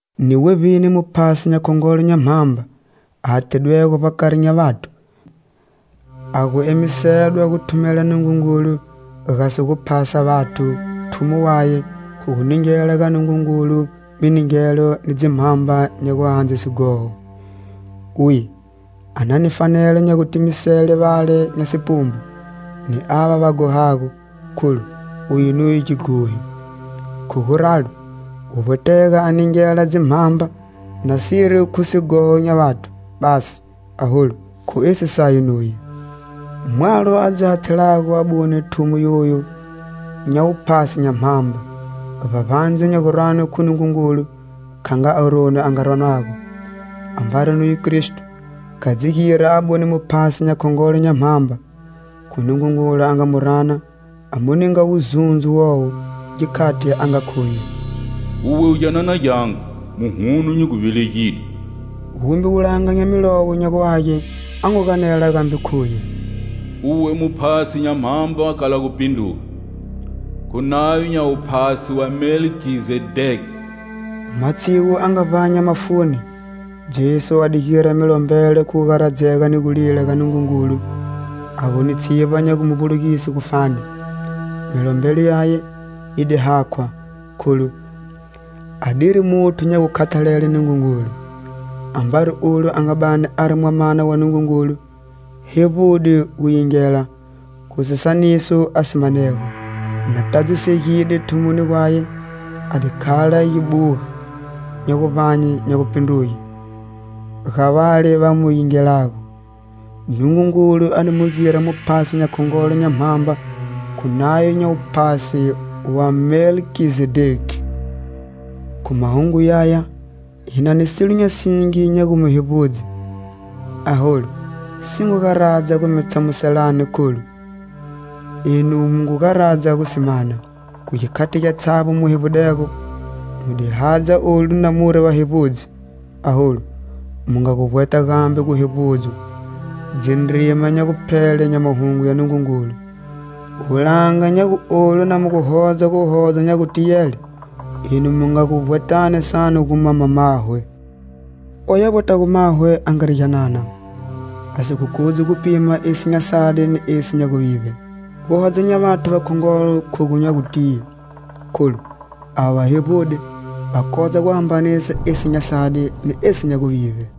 Ni wevbini muphasi nya khongolo nya mhamba a hathidwego vbakari nya vathu, a gu emisedwa gu thumela Nungungulu gasi gu phasa vathu, thumo waye khu gu ningela ga Nungungulu miningelo ni dzimhamba nya guhandze sighoho. Uye a na ni fanelo nya gutimisele vale nya sipumbu, ni ava va ghohago, kholu uye nuye gighohi. Khu guralo, guvbwetega a ningela dzimhamba, nasiri khu sighoho nya vathu basi, aholu, khu esi saye nuye. Mwalo a dzi hathelago abune thumo yoyu nya wuphasi nya mhamba, vbavbandze nya guranwe khu Nungungulu, kha nga Aroni a nga ranwago. Ambari nuye Kristo, kha dzi gira abune Muphasi nya khongolo nya mhamba. Khu Nungungulu a nga mu rana a mu ninga wuzundzo wowo, gikhati a nga khuye: "Uwe u gyanana gyangu,muhuno nyi gu velegide." Wumbe wulanga nya Milowo nya gu Age a ngu ganela gambe khuye: "Uwe u muphasi nya mhamba kala gupindruga,khu nayo nya wuphasi wa Melkizedeki." Matshigu a nga vbanya mafuni, Jesu a di gira milombelo khu gugaradzega ni gulila ga Nungungulu a gu ni tshivba nya gu mu vbulugise gufani. Milombelo yaye yi di hakhwa, kholu a diri muthu nya gukhathalele Nungungulu. Ambari ulo a nga bani ari Mwamana wa Nungungulu hevbude gu yingela khu sisaniso a si manego. Na tadzisegide thumoni gwaye, a di khala gibuga nya guvbanye nya gupindruge ga vale va mu yingelago. Nungungulu a di mu gira muphasi nya khongolo nya mhamba khu nayo nya wuphasi wa Melkizedeki. Khu mahungu yaya, hi na ni silo nya singi nya gu mi hevbudze, aholu, si ngu garadza gu mi tshamuselani, kholu enu mu ngu garadza gu si mana. Khu gikhati gyatshavbo mu hevbudego, mu di hadza olu na muri vahevbudzi, aholu, mu nga gu vbweta gambe guhevbudzwa dzindrima nya guphele nya Mahungu ya Nungungulu. Wulanga nya gu olu na mu gu hodza guhodza nya gutiyele, enu mu nga gu vbwetani sanu gu mama mahwe. Oyu a vbwetago mahwe, a ngari gyanana, a si gu kodzi gu pima esi nya sadi ni esi nya guvivbe. Guhodza nya vathu vakhongolo khogu nya gutiye, kholu avo va hevbude va kodza guhambanisa esi nya sadi ni esi nya guvivbe.